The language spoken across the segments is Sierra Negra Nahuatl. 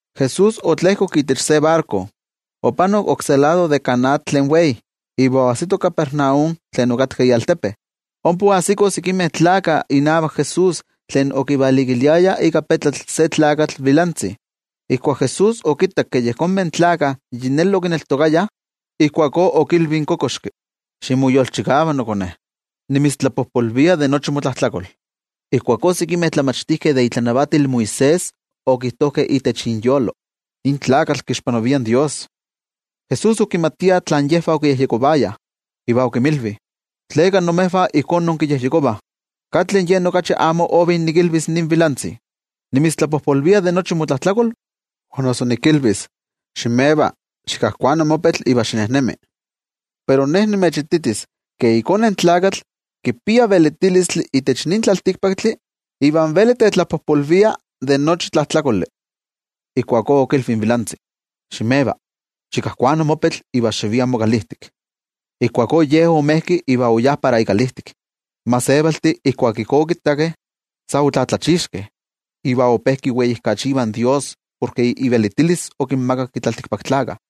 Jesús otlejkok itech se barko, opanok oksé lado de kan atl tlen wei, iva oajsito Capernaum tlen okatka ialtepe. Ompa oajsikoh sekimeh tlakah inavak Jesús okivalikiliayah se tlakatl vilantzi ika ikochpetl. Ijkuak Jesús okittak ke yejonmeh tlakah yi neli okineltokayah, ijkuakó okilvi in kokoxki: —Ximoyolchikava nokone, nimitztlapojpolvia de nochi motlajtlakol. Ijkuakó sekimeh tlamachtijkeh de itlanavatil Moisés okijtojkeh itech inyolo: “Nin tlakatl kixpanavia in Dios.” Jesús okimatia tlen yejvah okiyejyekovayah, iva okinmilvi: —¿Tleka imejvah ijkó inkiyejyekovah? ¿Katli yen okachi amo ovi nikilvis nin vilantzi: “Nimitztlapojpolvia de nochi motlajtlakol”, o noso nikilvis: “Ximeva. Xikajkuana mokochpetl iva xinejnemi”? Pero Ne nimechititis ke iKone in Tlakatl, kipia velitilistli itech nin tlaltikpaktli, iva veli tetlapojpolvia de nochi tlajtlakoli. Ijkuakó okilvi in vilantzi: —Ximeva, xikajkuana mokochpetl iva xivia mokalijtik. Ijkuakó ye omejki iva oyá para ikalijtik. In gentejtih ijkuak ijkó okittakeh, omotetzavijkeh iva ope kiweijkachivah in Dios porke ivelitilis okinmakak in tlaltikpaktlakah.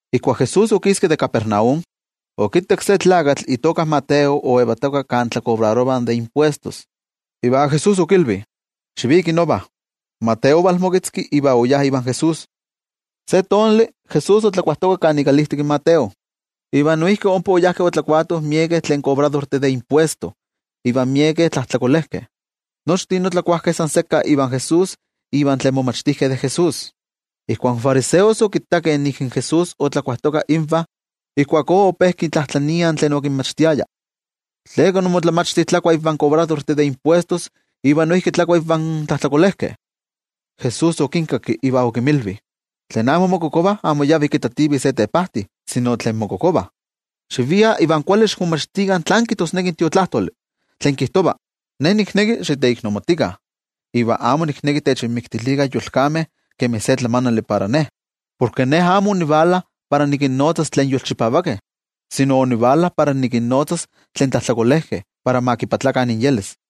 Ijkuak Jesús okiski de Capernaum, okittak se tlakatl itoka Mateo oyetoka kan tlakobrarovah de impuestos, iva Jesús okilvi: —Xiviki nova. Mateo omoketzki, iva oyá ivan Jesús. Se tonali, Jesús otlakuajtoka ikalijtik in Mateo, iva noijki ompa oyajkeh otlakuatoh miekeh kobradortih de impuestos iva miekeh tlajtlakolejkeh. Nochtin otlakuajkeh san sekka ivan Jesús ivan tlen momachtijkeh de Jesús. Ijkuak in fariseos okittakeh nik in Jesús otlakuajtoka invah, ijkuakó ope kintlajtlaniah tlen okinmachtiaya: —¿Tleka imotlamachti tlakua ivan kobradortih de impuestos iva noijki tlakua ivan tlajtlakolejkeh? Jesús okinkakki iva okinmilvi: —Tlen amo mokokovah amo yavih kitativih se tepajti, sino tlen mokokovah. Xiviah iva kuali xikmomachtikah tlán kijtosneki in Tiotlajkuiloli kan kijtova: “Ne nikneki xiteiknomatikah iva amo nikneki techinmiktilikah yolkameh kemi se tlamanali para Ne.” Porke Ne amo onivala para nikinnotzas tlen tlakamelajkeh, sino tlen tlajtlakolejkeh para ma moyolkopakah.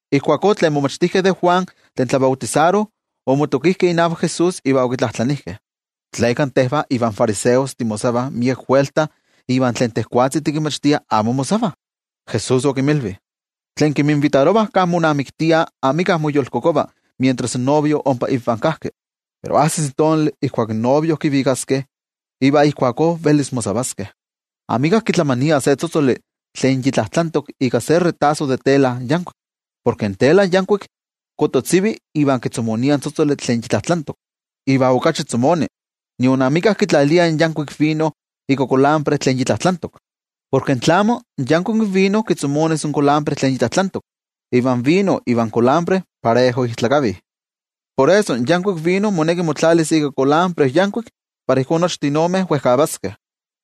Ijkuakó tlen momachtijkeh de Juan tlen tlabautisaro omotokijkeh inavak Jesús iva okitlajtlanijkeh: —¿Tleka tejvah ivan fariseos timosavah miek welta iva tlen tejwatzi tikinmachtia amo mosavah? Jesús okinmilvi: —Tlen kinminvitarovah kan monamiktiah amika moyolkokova mientras in novio ompa invah kajki. Pero ajsis tonali ijkuak in novio kivikaskeh, iva ijkuakó velis mosavaskeh. ’Amika kitlamania se tzotzoli tlen yi tlajtlantok ika se retaso de tela yankuik. Porke in tela yankuik kototzivi iva kitzomonia in tzotzoli tlen yi tlajtlantok, iva okachi tzomoni. Nion amika kitlalia yankuik vino ika kulambre tlen yi tlajtlantok. Porke tlamo, in yankuik vino kitzomonis in kulambre tlen yi tlajtlantok, iva in vino ivan kulambre parejo ijtlakavih. Por eso, in yankuik vino moneki motlalis ika kulambre yankuik para ijkó nochtin omeh wejkavaskeh.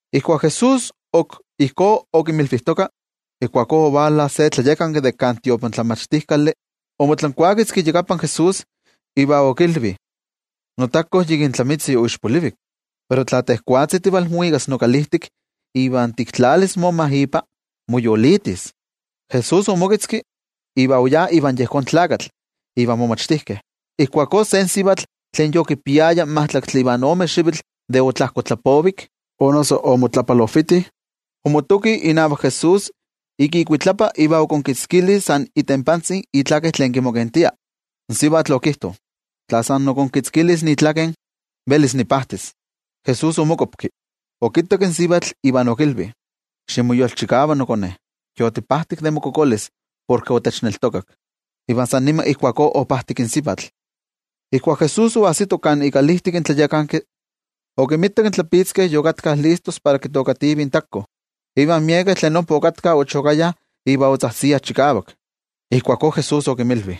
Ijkuak Jesús ok ijkó okinmilvijtoka, ijkuakó ovala se tlayakanki de kan tiotlamachtijkali, omotlankuaketzki iyakapan Jesús, iva okilvi: —Notakotzi yikin tlamitzi oixpolivik, pero tla tejwatzi tivalmuikas nokalijtik iva tiktlalis moma ipa, moyolitis. Jesús omoketzki, iva oyá ivan yejón tlakatl ivan momachtijkeh. Ijkuakó se sivatl tlen yokipiaya majtlaktli ivan ome xivitl de omotlapalojviti, omotoki inavak Jesús ik ikuitlapa iva okonkitzkili san itenpantzi itlaken tlen kimokentia. Porke in sivatl okiyejyekovaya: “Tla sikiera onikitzkiliskia itlaken, velis nipajtis.” Jesús omokuapki, okittak in sivatl iva okilvi: —Ximoyolchikava nokone, yotipajtik de mokokolis porke otechneltokak. Iva san niman ijkuakó opajtik in sivatl. Ijkuak Jesús oajsito kan ikalijtik in tlayakanki, okinmitak in tlapitzkeh yokatkah listos para kitookativih in takotzi, iva miekeh tlen ompa okatkah ochokayah iva otzajtziah chikavak. Ijkuakó Jesús okinmilvi: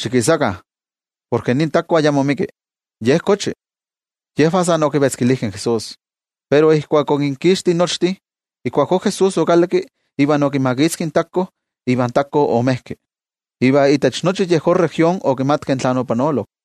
—Xikisakah, porke nin takotzi ayamo ixpolivi, ye kochi. Yejvah san okivetzkilijkeh in Jesús, pero ijkuak okinkixtijkeh nochtin, ijkuakó Jesús okalakki iva okimakitzki in takotzi, iva in takotzi omejki. Iva itech nochi yejón región okimatkeh tlen opanolok.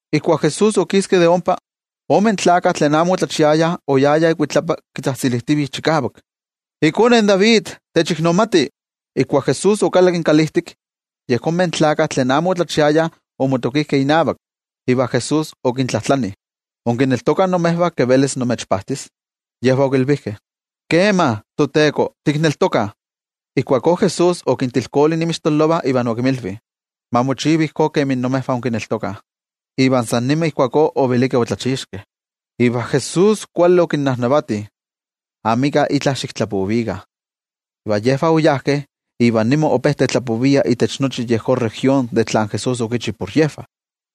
Ijkuak Jesús okiski de ompa, ome tlakah tlen amo otlachiayah oyayah ikuitlapa kitzajtzilijtivih chikavak: —¡IKone in David, techiknomati! Ijkuak Jesús okalakki kalijtik, yejonmeh tlakah tlen amo otlachiayah omotokijkeh inavak, iva Jesús okintlajtlani: —¿Inkineltokah imejvah ke velis nimechpajtis? Yejvah okilvijkeh: —Kema, toTeko, tikneltokah. Ijkuakó Jesús okintilkoli inmixtololovah iva okinmilvi: —Ma mochiva ijkó kemi imejvah inkineltokah. Iva san nima ijkuakó ovelikeh otlachixkeh. Iva Jesús kuali okinnajnavati: —Amika itla xiktlapovikah. Iva yejvah oyajkeh iva nima ope tetlapoviah itech nochi yejón región de tlen Jesús okichi por yejvah.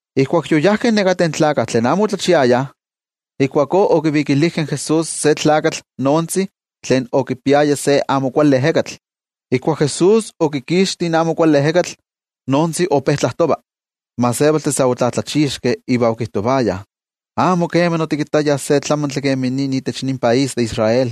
Ijkuak yoyajkeh nekateh tlakah tlen amo otlachiayah, ijkuakó okivikilijkeh in Jesús se tlakatl noontzi tlen okipiaya se amo kuali ejekatl. Ijkuak Jesús okikixti in amo kuali ejekatl, in noontzi ope tlajtova. In gentejtih sa otlatlachixkeh iva okijtovayah: —Amo kema otikittayah se tlamantli kemi nin itech nin país de Israel.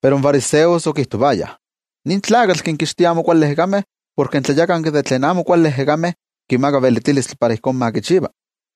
Pero in fariseos okijtovayah: —Nin tlakatl kinkixtia amo kuali ejekameh porke in tlayakanki de tlen amo kuali ejekameh kimaka ivelitilis para ijkó ma kichiva.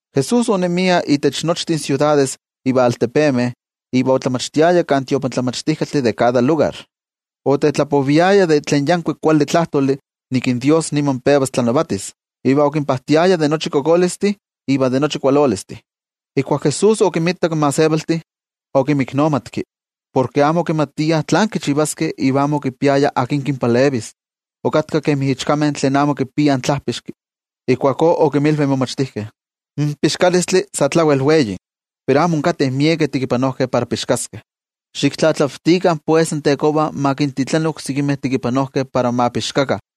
Jesús onemia itech nochtin siudades iva altepemeh, iva otlamachtiaya kan tiotlamachtijkaltih de kada lugar. Otetlapoviaya de tlen yankuik kuali tlajtoli nik in Dios niman pevas tlanavatis, iva okinpajtiaya de nochi kokolistli iva de nochi kualolistli. Ijkuak Jesús okinmitak in gentejtih, okimiknomatki porke amo okimatiah tlán kichivaskeh iva amo okipiayah akin kinpalevis, okatkah kemi ichkameh tlen amo kipiah tlajpixki. Ijkuakó okinmilvi in momachtijkeh: —In pixkalistli sa tlawel wei, pero amo onkateh miekeh tekipanojkeh para pixkaskeh. Xiktlatlavtikah pues in Tekova ma kintitlani oksekimeh tekipanojkeh para ma pixkakah.